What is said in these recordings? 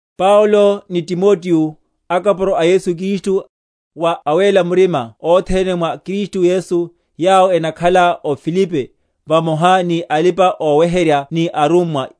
Paulo ni Timoteo, akapuro a Yesu Kristu, wa awéla murima othene mwa Kristu Yesu, yawo enakhala o Filipi, vamoha ni alipa‐oweherya ni arummwa.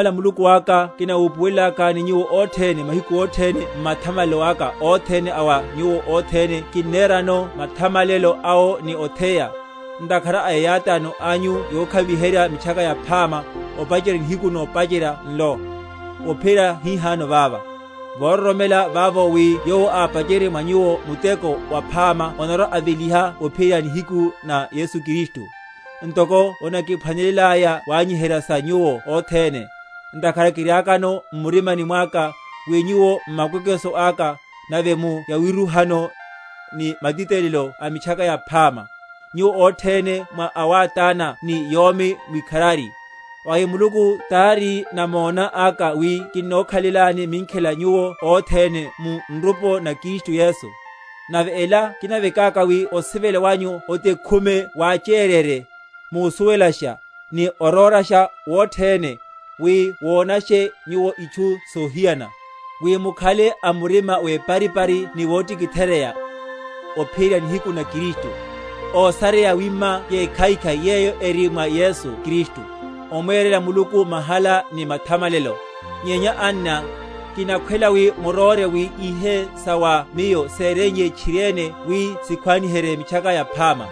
Kinnamuthamala Muluku aka kinawupuwelakani nyuwo othene; mahiku othene m’mathamalelo aka othene a wa nyuwo othene kinnerano mathamalelo awo ni otheya, ntakhara a eyátáno anyu yokhaviherya Mitchaka Yaphama, opacherya nihiku nopacherya nlo, ophiyerya hihano vava; vororomela vavo, wi Yowo ápachenrye mwa nyuwo muteko waphama onarwa‐aveliha ophiyerya nihiku na Yesu Kristu; ntoko onakiphwanelelaya wanyiherya sa nyuwo othene, ntakhara kiriakano m’murimani mwaka, wi nyuwo m’makwekweso aka, nave mu yawirúhano, ni matitelelo a Mitchaka Yaphama, nyuwo othene mwa awátána ni yomi mwikharari. Vawi Muluku tari namona aka, wi kinnokhalelani minkhela nyuwo othene mu nrupo na Kristu Yesu. Nave ela kinavekaka, wi osivela wanyu othekumele wacheryeryeye, musuwelasha, ni orórasha wothene; wi monashe nyuwo itchu sohiyana; wi mukhale a murima weparipari ni wohitcheka, ophiyerya nihiku na Kristu; ósareya yawima yekhaikhai, yeyo eri mwa Yesu Kristu, omwerela Muluku mahala ni mathamalelo. Nyenya anna, kinakhwela wi muróre wi ihe sa wa miyo séreiye tchiriene wi sikhwaniherye Mitchaka Yaphama;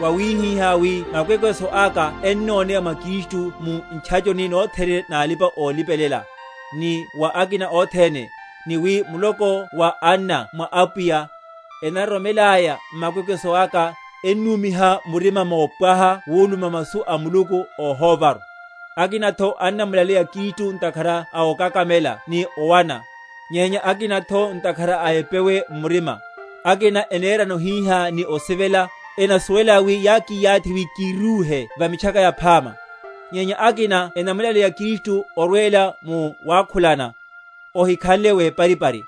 wawihiha wi makwekweso aka ennoneya mwa Kristu mu ntchachoni nothene na alipa‐olipelela, ni wa akina othene; ni wi muloko wa anna mwa Apwiya, enaroromelaya m’makwekweso aka, ennúmiha murima mopwaha wuluma masu a Muluku óhóvaru. Akinatho annamulaleya Kristu ntakhara a okakamela ni owana; nyenya akinatho ntakhara a epewe m’murima; akina enerano hihá ni osivela, enasuwelaya wi yákiyathi wi kírúhe va Mitchaka Yaphama; nyenya akina enamulaleya Kristu orwela mu wakhulana ohikhanle weparipari,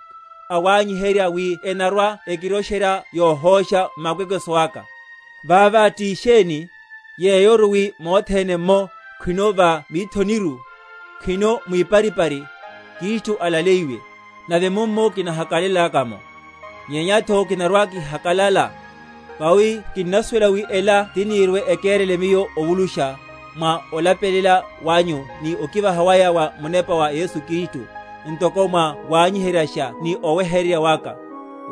awanyiherya wi enarwa?-?ekirosherya yohósha m’makwekweso aka. Vava ti sheni? Yeyoru wi mothene’mmo, khwino va mithoniru, khwino mwiparipari, Kristu alaleyiwe; nave mummo kinahakalalelaka’mo, nyenyatho kinarwa‐kihakalala. Vawi kinnasuwela wi ela tinirwe‐ekerele miyo ovulusha, mwa olapelela wanyu ni okivaha waya wa Munepa wa Yesu Kristu; ntoko mwa wanyiheryasha ni oweheryerya waka,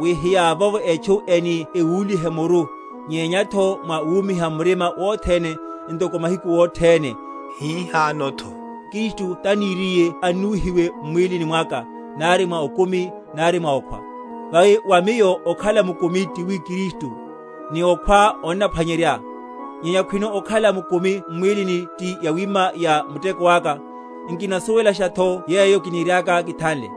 wi hiyavovo etchu eni ekúlihe muru, nyenyatho mwa wumiha murima wothene, ntoko mahiku othene, hihanotho Kristu taniriye annuwihiwe m’mwílini mwaka, nari mwa okumi, nari mwa okhwa. Vawi wa miyo okhala mukumi ti wi Kristu, ni okhwa onnaphwanyerya. Nyenya khwino okhala mukumi m’mwílini, ti yawima ya muteko aka, nkinasuwelashatho yeyo kiniriaka kithanle.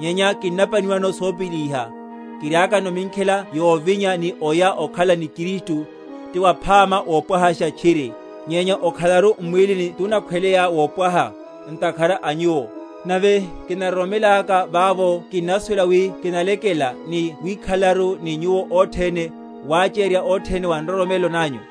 Nyenya kinnapaniwano sopíli iha, kiriakano minkhela yovinya ni oya okhala ni Kristu, ti waphama wopwahasha tchiri; nyenya okhalaru m’mwílini tunakhweleya wopwaha, ntakhara a nyuwo. Nave kinaroromelaka vavo kinnasuwela wi kinalekela, ni wikhalelaru ni nyuwo othene, wachererya othene wa nroromelo nanyu;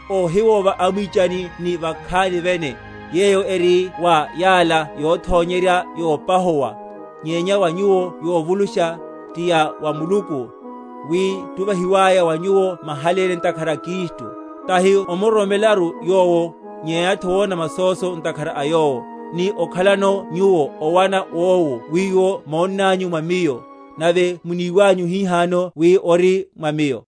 óhiwova amwichani ni vakhani vene, yeyo eri wa yala yothonyerya yopahuwa, nyenya wa nyuwo yovulusha, ti ya wa Muluku; wi tuvahiwaya wa nyuwo mahaléne ntakhara a Kristu, tahi omuroromelaru Yowo, nyenyatho wona masóso ntakhara a Yowo, ni okhalano nyuwo owana wowu wiwo monnanyu mwa miyo, nave muniwanyu hihano wi ori mwa miyo.